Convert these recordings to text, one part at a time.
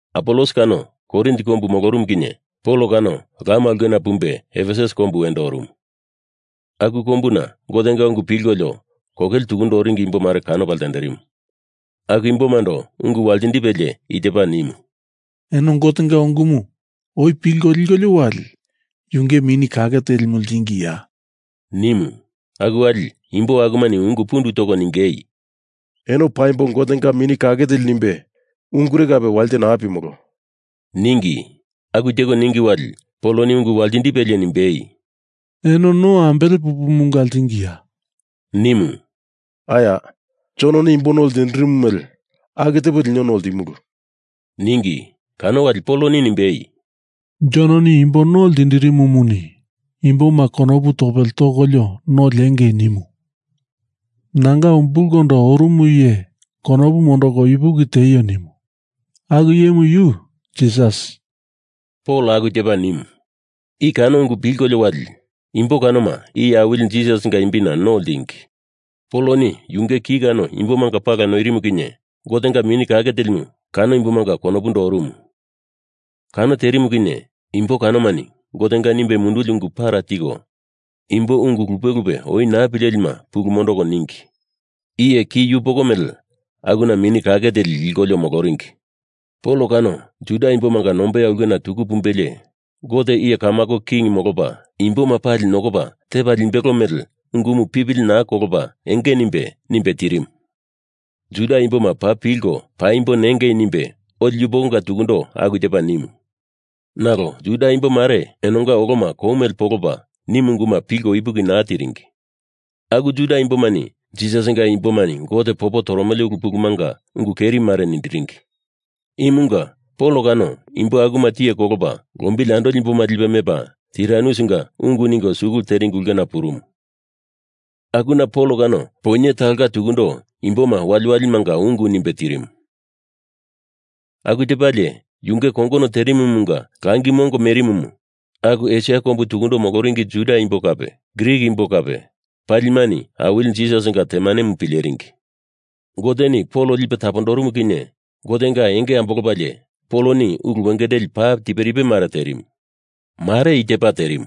Apolos kano Korin kombu molorumu kinye Pol kano lama aulkena pumbe Efesus kombu wendo orumu. Aku kombuna Gotenga ungu pilkolio kokele tukundo oringi imbo mare kanopa ltenderimu. Aku imbomando ungu waltindipe i tepa nimu, “Eno Gotenga ungumu oi pilko likolio wali Yunge Mini Kake Telimu ltingiya,” nimu. Aku wali imbo akumani ungu pundu toko ningei, “Eno paimbo Gotenga Mini Kake Teli nimbe ungure kape walite naa pimolo,” ningi. Aku teko ningi wali Poloni ungu waltindipelie nimbei, “Eno no ambele pupumunga ltingiya?” nimu. “Aya, Jononi imbo no ltindirimu mele aku tepo lino no ltimulu,” ningi. Kano wali Poloni nimbei, “Jononi imbo no ltindirimumuni imboma konopu topele tokolio no liengei nimu. Nanga umbulkondo orumu iye konopu mondoko ipuki tieio nimu. Aku iyemu yu Jisas,” Pol aku tepa nimu. I kano ungu pilkolio wali imbo kanoma Iye Awili Jisasinga imbina no ltingi. Poloni yunge ki kano imbomanga pala noirimu kinye Gotenga Mini Kake Telimu kano imbomanga konopundo orumu. Kano terimu kinye imbo kanomani Gotenga nimbe munduli ungu para tiko imbo ungu lupe lupe oi naa pilelima pulu mondoko ningi. Iye ki yupoko mele akuna Mini Kake Teli likolio moloringi. Pol kano Juda imbomanga nombeya ulkena tuku pumbelie Gote iye kamako king molopa imboma pali nokopa tepa limbelo mele ungumu pipili naa kolopa enge nimbe, nimbe tirimu. Juda imboma paa pilko paimbo nengei nimbe oli yupokonga tukundo aku tepa nimu. Nalo Juda imbo mare enonga oloma kou mele polopa nimu unguma pilko ipuki naa tiringi. Aku Juda imbomani Jisasinga imbomani Gote popo toromele ulu pulumanga ungu keri mare nindiringi. Imunga Pol kano imbo akuma tiye kolopa lombili andoli imboma lipe mepa Tiranusinga ungu ningo skul teringi ulkena purumu. Akuna Pol kano poinye talonga tukundo imboma waliwalimanga ungu nimbe tirimu. Aku tepalie, yunge kongono terimumunga langi mongo merimumu aku Esia kombu tukundo moloringi Juda imbo kape Grik imbo kape palimani Awili Jisasinga temanemu pileringi. Goteni Pol lipe tapondorumu kinye Gotenga enge ambolopalie Poloni ulu wengendeli paa tiperipe mare terimu. Mare i tepa terimu.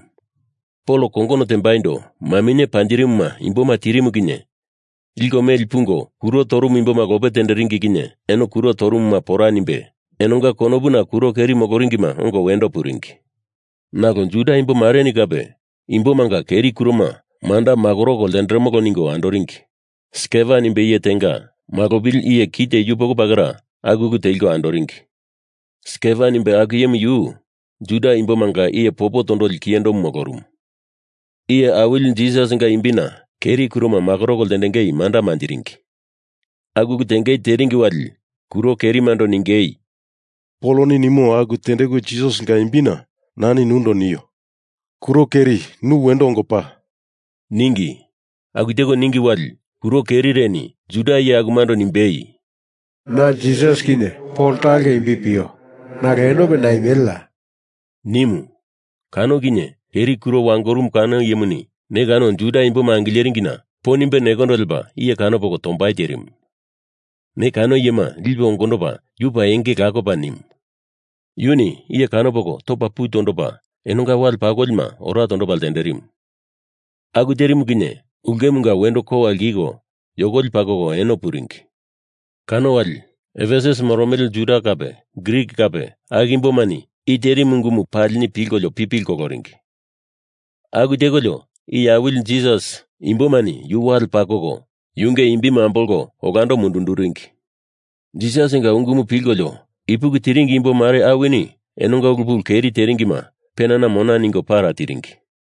Pol kongono tembaindo maminye panjirimuma imboma tirimu kinye liko meli pungo kuro torumu imboma lope tenderingi kinye enonga kuro torumuma pora nimbe enonga konopuna kuro keri moloringima ongo wendo puringi. Nalo Juda imbo mareni kape imbomanga keri kuroma manda makoroko ltenderemolo ningo andoringi. Skeva nimbe iye tenga malopili iye kite yupoko pakera aku ulu teliko andoringi. (Skeva nimbe aku iyemu yu Juda imbomanga iye popo tondoli kiyendomu molorumu.) Iye Awili Jisasinga imbina keri kuroma makoroko ltengei manda manjiringi. Aku ulu tengei teringi wali kuro kerimando ningei, “Poloni nimo aku tendeku Jisasinga imbina nani nundo nio, kuro keri nu wendo ongo pa!” ningi. Aku teko ningi wali kuro kerireni Juda iye akumando nimbei, “Na Jisas kinye Pol talo imbi pio nalo enope naimeleya?” nimu. Kano kinye keri kuro wangorumu kano iyemuni ne kano Juda imboma angileringina po nimbe nendo lepa iye kanopoko tombai terimu. Ne kano iyema lipe ongondopa yu paa enge lakopa nimu. Yuni iye kanopoko topa pu tondopa enonga wale pakolima ora tondopa ltenderimu. Aku terimu kinye ulkemunga wendo kowa lkiko yokoli pakoko eno puringi. Kano wali Efesus moromele Juda kape Grik kape aku imbomani i terimu ungumu palini pilkolio pipili koloringi. Aku tekolio Iye Awili Jisas imbomani yu wale pakoko yunge imbimu ambolko olando mundunduringi. Jisasinga ungumu pilkolio ipuki tiringi imbo mare awini enonga ulu pulu keri teringima penana mona ningo para tiringi.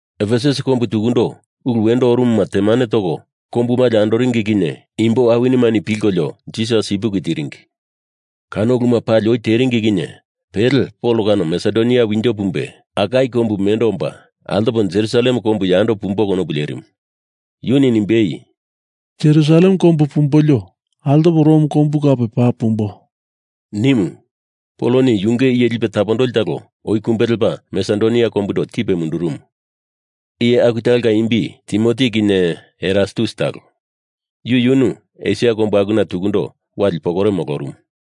Efesus kombu tukundo ulu wendo orumuma temane toko kombu malio andoringi kinye imbo awinimani pilkolio Jisas ipuki tiringi. Kano uluma pali oi teringi kinye pele Pol kano Masedonia winjo pumbolio Akaia kombu mendo omba altopa Jerusalem kombu yando pumbo konopu lerimu. Yuni nimbei, “Jerusalem kombu pumbolio altopo Rom kombu kape paa pumbo,” nimu. Poloni yunge iye lipe tapondoli talo oi kumbe lepa Masedonia kombundo tipe mundurumu. Iye aku talonga imbi Timoti kinye Erastus talo. Yu yunu Esia kombu akuna tukundo wali pokore molorumu.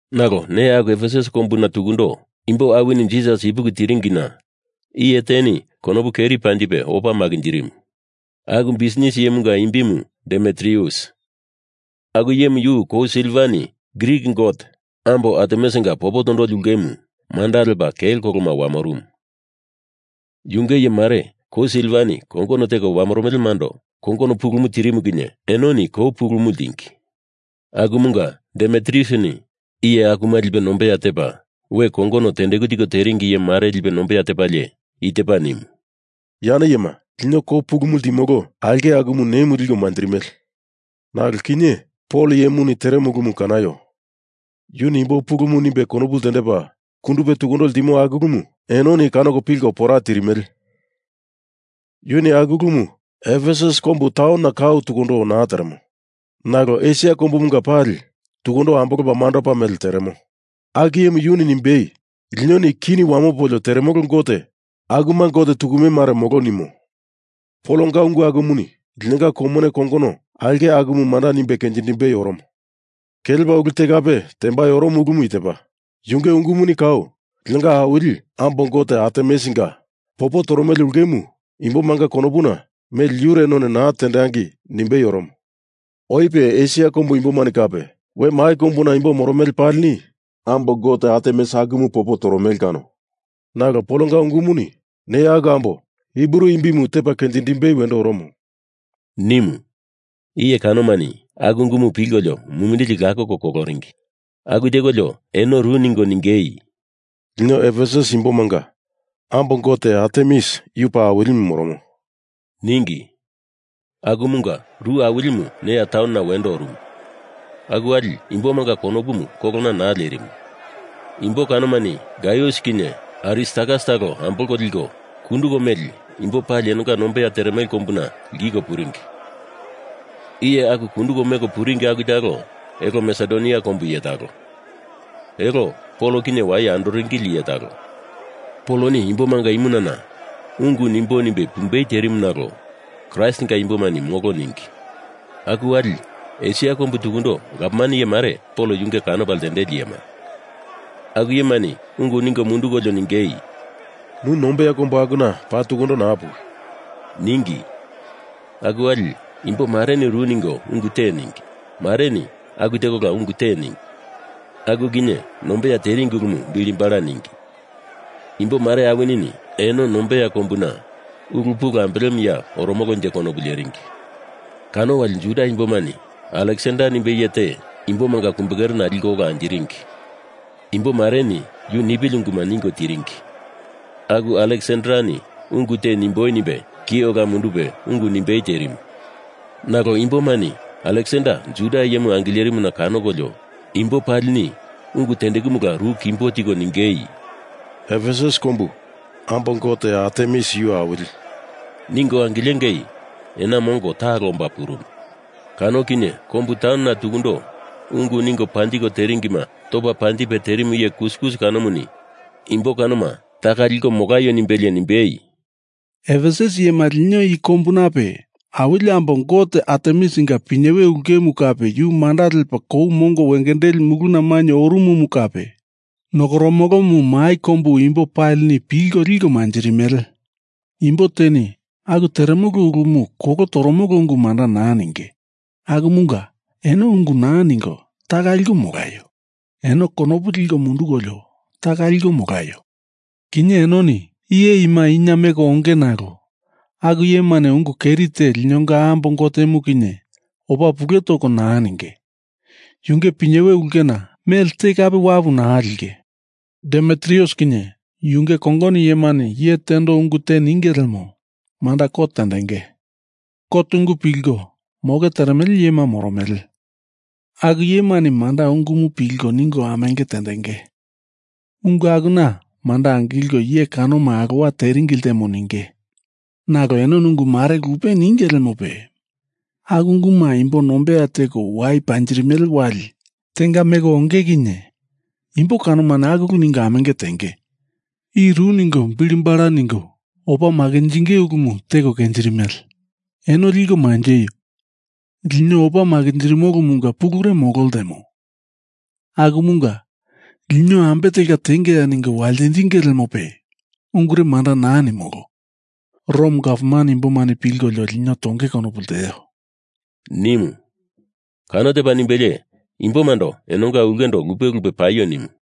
Nalo neya aku Efesus kombuna tukundo imbo awinini Jisas ipuki tiringina iye teni konopu keri panjipe opa makinjirimu. Aku bisnis iyemumunga imbimu Demitrius. Aku iyemu yu kou silvani Grik gote ambo Artemisinga popo tondoli ulkemu manda lepa kelo koloma wamorumu. Yunge iye mare kou silvani kongono teko wamoromelemando kongono pulumu tirimu kinye enoni kou pulumu ltingi. Akumunga Demitriusini iye akuma lipe nombeya tepa we kongono tendeku tiko teringi iye mare lipe nombeya tepalie i tepa nimu, “Yane iyema lino kou pulumu ltimolo aulke akumu ne imu liko manjirimele. Nalo kinye Pol iye imuni teremo ulumu kanaio. Yuni imbo pulumu nimbe konopu ltendepa kundupe tukundo ltimo aku ulumu enoni kanoko pilko pora tirimele. Yuni aku ulumu Efesus kombu taunona kau tukundo naa teremo nalo Esia kombumunga pali tukundo ambolopa mandopa mele teremo. Aku iyemu yuni nimbei, Linoni kini wamopolio teremolo gote akuma gote tukume mare molo nimo. Polonga ungu akumuni lino kou mone kongono aulke akumu manda nimbe kenjindimbei oromo. Kelepa ulu te kape tembai oromo ulumu i tepa, Yunge ungumuni kau linonga awili ambo gote Artemisinga popo toromele ulkemu imbomanga konopuna mele yure none naa tendangei nimbei oromo. Oipe Esia kombu imboni kape we mai kombuna moromele imbo palini ambo gote Artemis akumu popo toromele kano. Nalo Polonga ungumuni neya aku ambo Hibru imbimu tepa kenjindimbei wendo oromo,” nimu. Iye kanomani aku ungumu pilkolio mumindili lakoko koloringi. Aku tekolio eno ru ningo ningei, “Lino Efesus imbomanga ambo gote Artemis yu paa awilimu moromo,” ningi. Akumunga ru awilimu neya taunona wendo orumu. Aku wali imbomanga konopumu kolona naa lerimu. Imbo kanomani Gaius kinye Aristarkas talo ambolko liko kunduko meli imbo pali enonga nombeya teremele kombuna lkiko puringi. Iye aku kunduko meko puringi aku talo elo Masedonia kombu iye talo. Elo Pol kinye waye andoringili iye talo. Poloni imbomanga imunana ungu nimboi nimbe pumbei terimu nalo Kraistinga imbomani molo ningi. Aku wali Esia kombu tukundo gavman iye mare Pol yunge kanopa ltendeli iyema. Aku iyemani ungu ningo mundukolio ningei, “Nu nombeya kombu akuna paa tukundo naa puwi,” ningi. Aku wali imbo mareni ru ningo ungu te ningi. Mareni aku tekola ungu te ningi. Aku kinye nombeya teringi ulumu bilibala ningi. Imbo mare awinini eno nombeya kombuna ungu pulu ambelemuya oromolonje konopu leringi. Kano wali Juda imbomani Aleksander nimbe iye te imbomanga kumbekerena liko ola anjiringi. Imbo mareni yu nipili unguma ningo tiringi. Aku Aleksandereni ungu te nemboi nimbe ki ola mundupe ungu nimbei terimu. Nalo imbomani Aleksander Juda iyemu angilerimuna kanokolio imbo palini ungu tendekumula ru kimbo tiko ningei, “Efesus kombu, ambo gote Artemis yu awili,” ningo angilengei ena mongo talo omba purumu. Kano kinye kombu taunona tukundo ungu ningo panjiko teringima topa panjipe terimu iye kuskus kanomuni imbo kanoma taka liko molaio nimbelie nimbei, “Efesus iyema, lino i kombunape awili ambo gote Artemisinga pinyewe ulkemu kape yu manda lepa kou mongo wengendeli muluna mainye orumumu kape nokoromolomu mai kombu imbo palini pilko liko manjirimele. Imbo teni aku teremolo ulumu kolo toromolo ungu manda naa ninge. Akumunga eno ungu naa ningo taka liko molaio. Eno konopu liko mundukolio taka liko molaio. Kinye enoni iye ima ina meko onge nalo aku iyemani ungu keri te linonga ambo gotemu kinye opa pule toko naa ninge. Yunge pinyewe ulkena mele te kape wapu naa linge. Demitrius kinye yunge kongono iyemani iye tendo ungu te ningei lemo, manda kot tendenge. Kot ungu pilko moke teremele iyema moromele. Aku iyemani manda ungumu pilko ningo amenge tendenge. Ungu akuna manda angilko iye kanoma alowa teringi ltemo ninge. Nalo enoni ungu mare lupe ninge lemope aku unguma imbo nombeya teko wai panjirimele wali tenga meko wangei kinye imbo kanomani aku ulu ningo amenge tenge. I ru ningo bili bala ningo opa makinjingei ulumu teko kenjirimele. Eno liko manjeio. Lino opa makinjirimolomunga pulure molo ltemo. Akumunga lino ambe telka tengeya ningo waltindinge lemope ungure manda naa nimolo. Rom gavman imbomani pilkolio lino tongei konopu lteo,” nimu. Kano tepa nimbelie imbomando enonga ulkendo lupe lupe paio nimu.